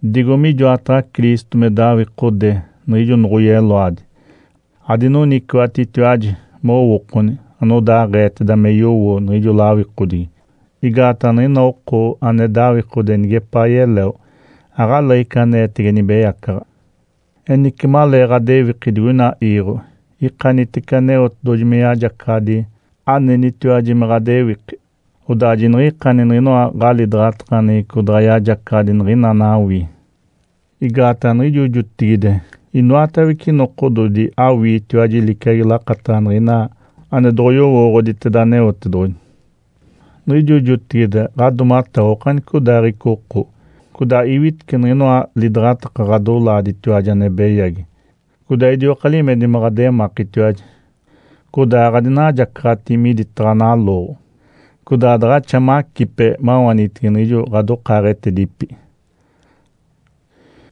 Digo mijoataɡ̶a Cristo me dawikode niɡ̶ijo noɡ̶oyeloadi, adinoniciwaɡ̶atitiwaji mowookoni anodaaɡ̶eeteda me yowo niɡ̶ijo lawikodigi. Igaataɡ̶a niɡ̶ina oko ane dawikode neɡ̶epaa yeleo aɡ̶aleeɡ̶ica aneetege nibeyacaɡ̶a. Enice, malee ɡ̶adewiki digoina iiɡ̶o, ikanitece Aneotedoɡ̶oji me yajacaɡ̶adi anenitiwaji me ɡ̶adewiki, odaa jiniɡ̶ikani niɡ̶inoa ɡ̶alidaɡ̶atakaneɡ̶eco daɡ̶a yajacaɡ̶adi niɡ̶ina anawii. Igaataɡ̶a niɡ̶ijo jotigide inoatawece nokododi awiitiwaji liciagi lakataɡ̶a niɡ̶ina ane doɡ̶oyowooɡ̶oditeda Aneotedoɡ̶oji. Niɡ̶ijo jotigide ɡ̶adoomatewa okanicodaaɡ̶ica oko, codaa iwitece niɡ̶inoa lidaɡ̶ataka ɡ̶adolaaditiwaji ane beyagi, codaa idioka limedi me ɡ̶ademakitiwaji, codaa aɡ̶adinajacaɡ̶ati miditaɡ̶a nalooɡ̶o, codaa daɡ̶axa macipe mawanitege niɡ̶ijo ɡ̶adokaaɡ̶etedipi.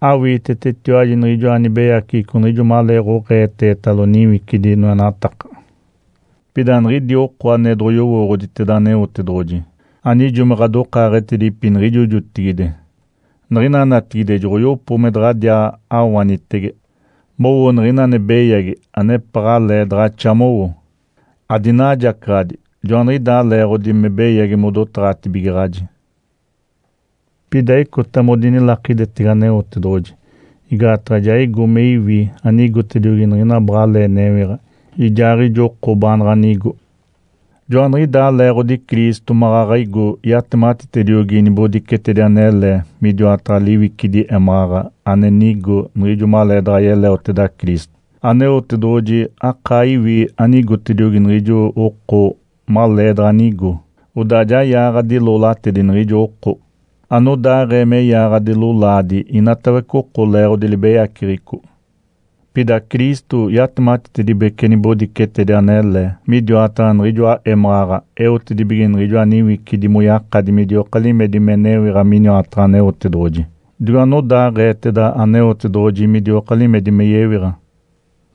Awiitetetiwaji niɡ̶ijoa nibeyaceɡ̶eco niɡ̶ijo malee oɡ̶eetetalo niwicidi noenataka. Pida niɡ̶idi oko ane doɡ̶oyowooɡ̶oditeda Aneotedoɡ̶oji, anijo me ɡ̶adokaaɡ̶etedipi niɡ̶ijo jotigide, niɡ̶ina natigide joɡ̶oyopo me daɡ̶adiaa awanitege mowo niɡ̶ina ane beyagi anepaɡ̶alee daɡ̶axa mowo, adinajacaɡ̶adi. Joaniɡ̶idaa leeɡ̶odi me beyagi modotaɡ̶atibigaɡ̶aji. Pida icota modinilakidetege Aneotedoɡ̶oji, igaataɡ̶a ja igo me iwi anigotediogi niɡ̶ina baɡ̶alee newiɡ̶a, ijaaɡ̶ijo oko baanaɡ̶a nigo. Joaniɡ̶idaa leeɡ̶odi Cristo maɡ̶aɡ̶a igo yatematitediogi nibodicetedi anele midiwataɡ̶a liwicidi émaɡ̶aɡ̶a ane nigo niɡ̶ijo maleedaɡ̶a yeleoteda Cristo. Aneotedoɡ̶oji akaa iwi anigotediogi niɡ̶ijo oko maleedaɡ̶a nigo, odaa ja yaaɡ̶adi loolatedi niɡ̶ijo oko, anodaaɡ̶ee me yaaɡ̶adi lolaadi inatawece oko leeɡ̶odi libeyaceɡ̶eco. Pida Cristo yatematitedibece nibodicetedi anele midiwataɡ̶a niɡ̶ijoa émaɡ̶aɡ̶a eotedibige niɡ̶ijoa niwicidi moyakadi midioka limedi me newiɡ̶a miniwataɡ̶a Aneotedoɡ̶oji, digo anodaaɡ̶eeteda Aneotedoɡ̶oji midioka limedi me yewiɡ̶a.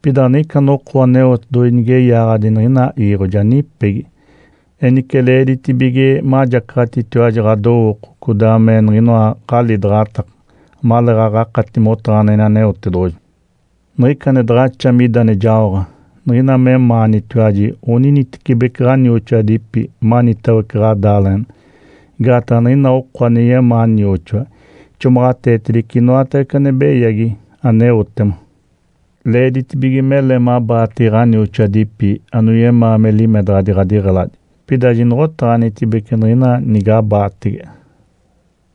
Pida niɡ̶ica noko Aneotedoɡ̶oji nige yaaɡ̶adi niɡ̶ina iiɡ̶o ja nipegi. Enice leeditibige majacaɡ̶atitiwaji ɡ̶adowooko codaa me niɡ̶inoa ɡ̶alidaɡ̶ataka, amaleeɡ̶aɡ̶a akati motaɡ̶aneɡ̶eni Aneotedoɡ̶oji. Niɡ̶ica ane daɡ̶axa mida ane jaoɡ̶a niɡ̶ina memaanitiwaji oninitecibeci ɡ̶anioxoadipi manitawece ɡ̶adaaleɡ̶ena. Igaataɡ̶a niɡ̶ina oko ane yemaa nioxoa ixomaɡ̶ateetedice inoatawece ane beyagi aneotema. Leeditibige mele mabaatege ɡ̶anioxoadipi anoyemaa me limedaɡ̶adi ɡ̶adiɡ̶eladi, pida jinoɡ̶otaɡ̶anitibece niɡ̶ina nigabaatege.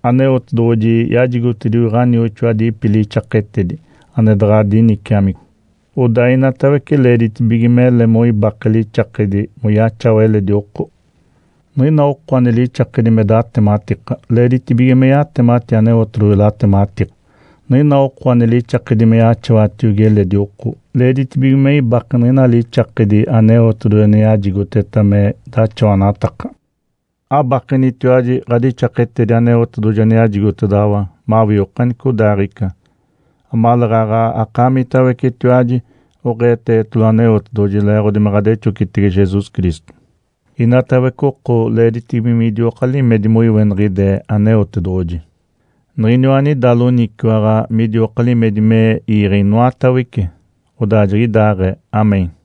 Aneotedoɡ̶oji yajigotediogi ɡ̶onioxoadipi lixaketedi ane daɡ̶a diniciamico. Odaa inatawece leeditibige mele moibake lixakedi moyaxawa eledi oko. Niɡ̶ina oko ane lixakedi me datematika, leeditibige me yatemati Aneotedoɡ̶oji latematiko. Niɡ̶ina oko ane lixakedi me yaxawatiogi eledi oko, leeditibige me ibake niɡ̶ina lixakedi Aneotedoɡ̶oji ane yajigoteta me daxawanataka. Abakenitiwaji ɡ̶adixaketedi Aneotedoɡ̶oji ane yajigotedaɡ̶awa mawii okanicodaaɡ̶ica, amaleeɡ̶aɡ̶a akaamitawecetiwaji oɡ̶eetetalo Aneotedoɡ̶oji leeɡ̶odi me ɡ̶adexocitege Jesus Cristo. Inatawece oko leeditibige midioka limedi moiweniɡ̶ide Aneotedoɡ̶oji, Niɡ̶iniwa anida loniciwaɡ̶a midioka limedi me iiɡ̶e inoatawece. Odaa jiɡ̶idaaɡ̶ee. Amém.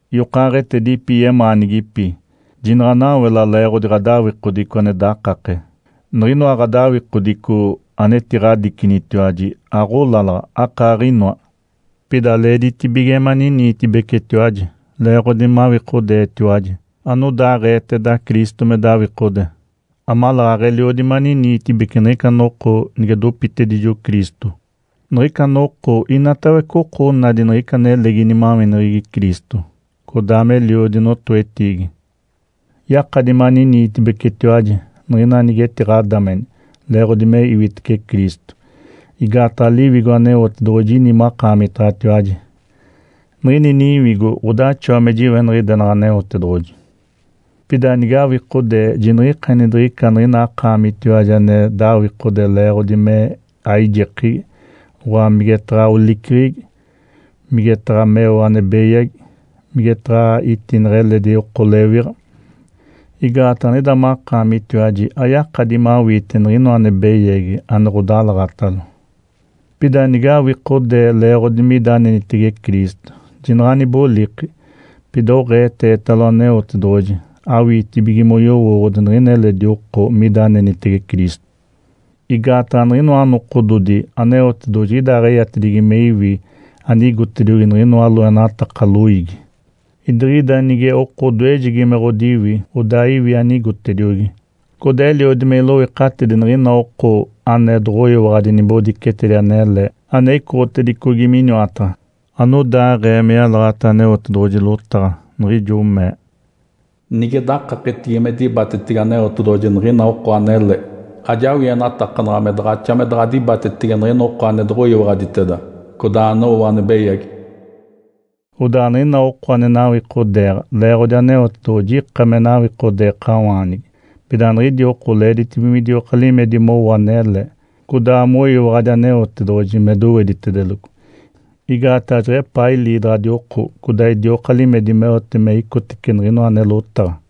Yokaaɡ̶etedipi yemaanigipi, jinaɡ̶anawela leeɡ̶odi ɡ̶adawikodico ane dakake. Niɡ̶inoa ɡ̶adawikodico anetiɡ̶adicinitiwaji aɡ̶olalaɡ̶a, akaaɡ̶inoa. Pida leeditibige maniniitibecetiwaji leeɡ̶odi mawikodeetiwaji anodaaɡ̶eeteda Cristo me dawikode, amaleeɡ̶aɡ̶a eliodi maniniitibece niɡ̶ica noko nige dopitedijo Cristo. Niɡ̶ica noko inatawece oko onadi niɡ̶ica nelegi nimaweneɡ̶egi Cristo, codaa meliodi notoetiigi. Yakadi maniniitibecetiwaji niɡ̶ina nige etiɡ̶adameni leeɡ̶odi me iwitece Cristo, igaataɡ̶a Liwigo Aneotedoɡ̶oji ini makaamitaɡ̶atiwaji, niɡ̶ini Niwigo ɡ̶odaxawa me jiweniɡ̶idenaɡ̶a Aneotedoɡ̶oji. Pida nigawikodee, jiniɡ̶ikani diɡ̶ica niɡ̶ina akaamitiwaji ane dawikode leeɡ̶odi me aijekegi, oɡ̶oa migetaɡ̶a oliceɡ̶egi, migetaɡ̶a meo ane beyagi, migetaɡ̶a itineɡ̶e eletidi oko lewiɡ̶a, igaataɡ̶a niɡ̶ida makaamitiwaji ayakadi mawiite niɡ̶inoa ane beyagi ane ɡ̶odalaɡ̶atalo. Pida nigawikodee leeɡ̶odi mida anenitege Cristo, jinaɡ̶a aniboliki, pida oɡ̶eetetalo Aneotedoɡ̶oji awiitibige moyowooɡ̶odi niɡ̶ina eledi oko mida anenitege Cristo. Igaataɡ̶a niɡ̶inoa nokododi Aneotedoɡ̶oji jiɡ̶idaaɡ̶eyatedigi me iwi anigotediogi niɡ̶inoa loenataka loiigi. Idiɡ̶ida nige oko odoejegi me ɡ̶odiwi, odaa iwi anigotediogi, codaa eliodi me iloikatidi niɡ̶ina oko ane doɡ̶oyiwaɡ̶adi nibodicetedi anele ane icoɡ̶otedicogi miniwataɡ̶a. Anodaaɡ̶ee me yalaɡ̶ata Aneotedoɡ̶oji lotaɡ̶a, niɡ̶ijo mee, “Nige dakaketigi me dibatetege Aneotedoɡ̶oji niɡ̶ina oko anele, ajawienatakanaɡ̶a me daɡ̶axa me daɡ̶a dibatetege niɡ̶ina ane doɡ̶oyiwaɡ̶aditeda, codaa anowo ane beyagi.” Odaa niɡ̶ina oko ane nawikodeeɡ̶a leeɡ̶odi Aneotedoɡ̶oji ika me nawikodeekawaanigi, pida niɡ̶idi oko leeditibige midioka limedi mowo anele, codaa moyiwaɡ̶adi Aneotedoɡ̶oji me doweditedeloco, igaataɡ̶a jeɡ̶epaa iliidaɡ̶adi oko codaa idioka limedi meote me icotece niɡ̶inoa ane lotaɡ̶a.